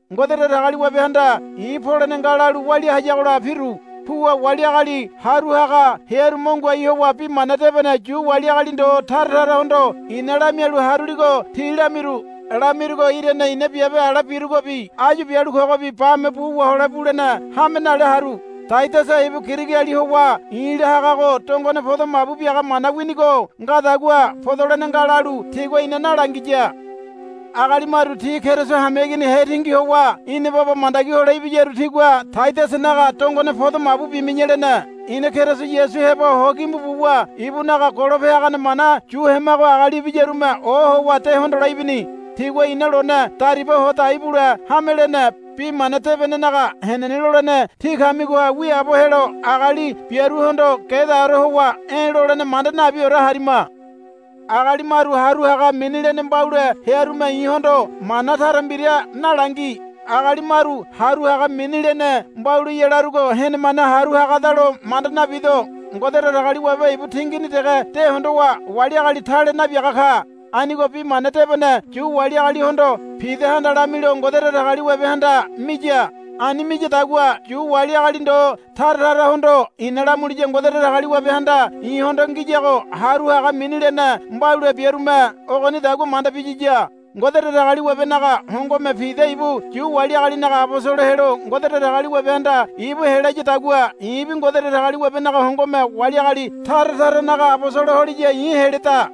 Ngode Datagaliwabehanda i̱ polene nga lalu walia hayagola piru. Puwa wali agali haru haga hearu mo ngoai howa Bi Mana Debene Yu wali agali ndo tara tarahondo i̱na lamialu haruligo ti lamiru. Lamirugo irane i̱na biabe ala birugobi áyu bialu kogobi bame bu wahole bulene hame nale haru. Taidasa ibu Girigiali howa i̱la hagago dongone podo mabu biaga mana winigo ngadagua, Podolene nga, lalu tigua ina nalangiya. Agali maru ti Keriso hameigini hetingi howa ina baba mandagi hole ibiyaru tigua, Taidasanaga dongone podo mabu bimi̱ya, lene. Ina Keriso Yasu heba ho gimbu buwa ibunaga golope hagane mana yu hemago agali ibiyarume ohowa de hondole ibini. Tigua ina lone dariba ho dai bule hame lene. Bi Mana Debenenaga henene lolene tí kamigoha wiaabo helo agali biaruhondo gedaore howa e̱ lolene manda nabiore harima. Agali maru haru haga mini lene mbaule hearume i̱hondo mana tara mbira nalangi. Agali maru haru haga mini lene mbauleya larugo henemane haru hagadalo manda nabido. Ngode Datagaliwabe ibu tingini dege de hondowa wali agali tale nabiaga ka. Anigo Bi Mana Debene Yu wali agalihondo Pidahanda lamilo Ngode Datagaliwabehanda miya. Ani miyadagua Yu wali agali ndo tara tarahondo i̱na lamuliya Ngode Datagaliwabehanda i̱hondo ngiyago haru haga mini lene mbaule biarume ogonidagua manda biyiya. Ngode Datagaliwabenaga hongome Pida ibu Yu wali agalinaga abosolo helo Ngode Datagaliwabehanda ibu helayadagua i̱bi Ngode Datagaliwabenaga hongome wali agali tara taranaga abosolo holiya i̱ heleda.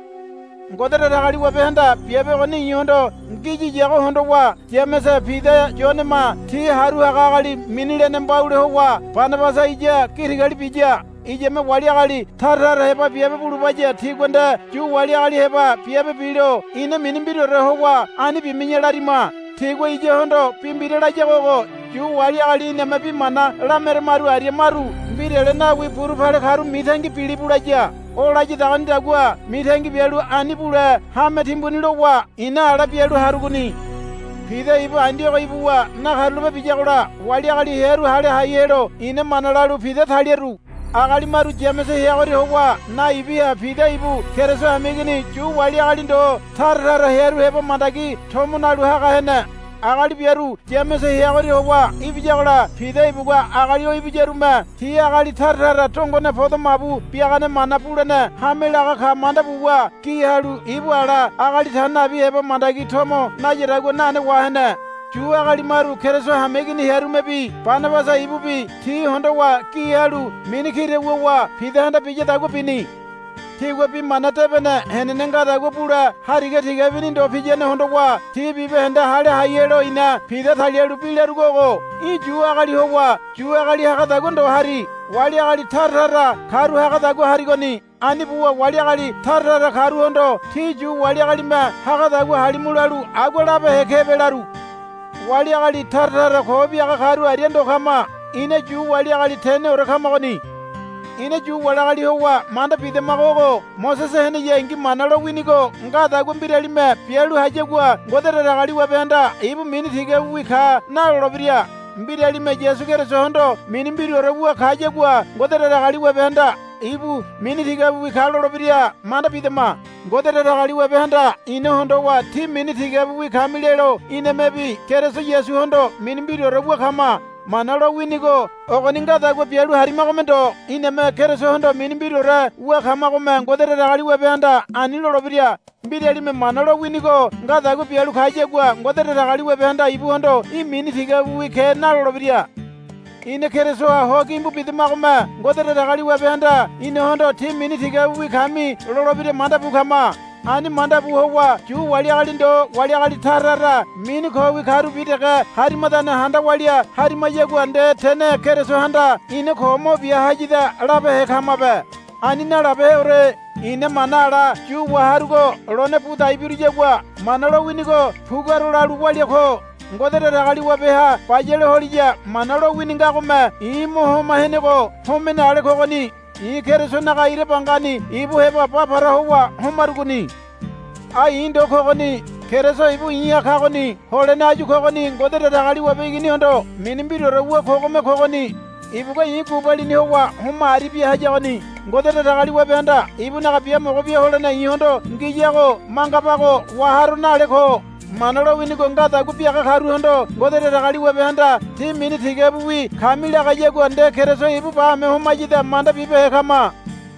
Ngode Datagaliwabehanda biabe ogoni i̱hondo ngiyiyago hondowa Yamese Pida Yonema ti haru haga agali mini lene mbaule howa Banabasa iya gi tigali biya. Iyame wali agali tara tara heba biabe bulubaya tigua nde Yu wali agali heba biabe bilo ina mini mbiraore howa ani bimi̱ya larima. Tigua iyahondo bi mbira layago ogo. Yu wali agali iname bi mana lameramaru aria maru mbirale nawi buru pale karu mitangi bilibu, laya. O layadagonidagua mitangi bialu ani bule hame timbuni lowa i̱na ala bialu harugoni. Pida ibu Andiogo ibuwa nakarulape biyagola wali agali hearu hale hai helo i̱na mana lalu Pida taliru. Agali maru Yamese heagoria howa naibiha Pida ibu Keriso hameigini Yu wali agali ndo tara tara hearu heba mandagi tomo nalu haga hene. Agali biaru Yamese heagoria howa ibiyagola Pida ibugua agali o ibiyarume ti agali tara tara dongone podo mabu biagane mana bulene hame laga ka manda buwa gi halu ibu ala agali ta nabi heba mandagi tomo nayadagua nane wahene. Yu agali maru Keriso hameigini hearumebi Banabasa ibubi ti hondowa gi halu mini kira wuwa Pidahanda biyadagua bini. Tigua Bi Mana Debene henene ngadagua bule hariga tigabini ndo piyane hondowa ti bibahende hale hai helo i̱na Pida talialu bi larugo ogo, Í̠ Yu agali howa Yu agali hagadagua ndo hari. Wali agali tara tara karu hagadagua harigoni. Ani buwa wali agali tara tara karuhondo ti Yu wali agalime hagadagua halimu lalu agua labehe kebe, laru. Wali agali tara tara ko biaga karu aria ndo kama. Ina Yu wali agali teneore kamagoni. Ina Yu wali agali howa manda bidamago ogo. Mosese heneyangi Mana lowinigo ngadagua mbiralime bialu hayagua Ngode Datagaliwabehanda, Ibu mini tigabiwi ka, nalolebira. Mbiralime Yasu Kerisohondo mini mbiraore wu kayagua Ngode Datagaliwabehanda, Ibu mini tigabiwi ka, lolebira manda bidama. Ngode Datagaliwabehanda ina hondowa, Tí mini tigabiwi kami, lelo inamebi Keriso Yasuhondo mini mbiraore wu kama. Mana lowinigo ogoni ngadagua bialu harimagome ndo iname Kerisohondo mini mbiraore wu kamagome Ngode Datagaliwabehanda ani lolebira. Mbiralime Mana lowinigo ngadagua bialu kayagua Ngode Datagaliwabehanda ibuhondo, Í̠ mini tigabiwi ke, nalolebira. Ina Kerisoha ho gimbu bidamagome Ngode Datagaliwabehanda inahondo, Tí mini tigabiwi kami, lolebira manda bu kama. Ani manda bu howa Yu wali agali ndo wali agali tara tara mini kowi karubi dege harimadane handa walia harimayagua nde tene Kerisohanda ina ko mo bia hayada labehe kamabe. Ani nalabeheore. I̱na mana ala yu waharugo lone bu dai biruyagua Mana lowinigo puguaro lalu walia ko. Ngode Datagaliwabeha bayale holiya Mana lowini ngagome i̱ mo homa henego homene ale kogoni. I̱ Kerisonaga ira bangani ibu heba ba para howa homarugoni. Ai i̱ ndo kogoni. Keriso ibu i̱ha kagoni. Holene áyu kogoni Ngode Datagaliwabe Iginihondo mini mbiraore wu kogome kogoni. Ibugua i̱ gubalini howa homa aribia hayagoni. Ngode Datagaliwabehanda ibunaga biamogo bia holene i̱hondo ngiyago mangabago waharo nale ko. Mana lowinigo ngadagua biaga karuhondo Ngode Datagaliwabehanda, Tí mini tigabiwi kami, lagayagua nde Keriso ibu bame homayada manda bibehe kama.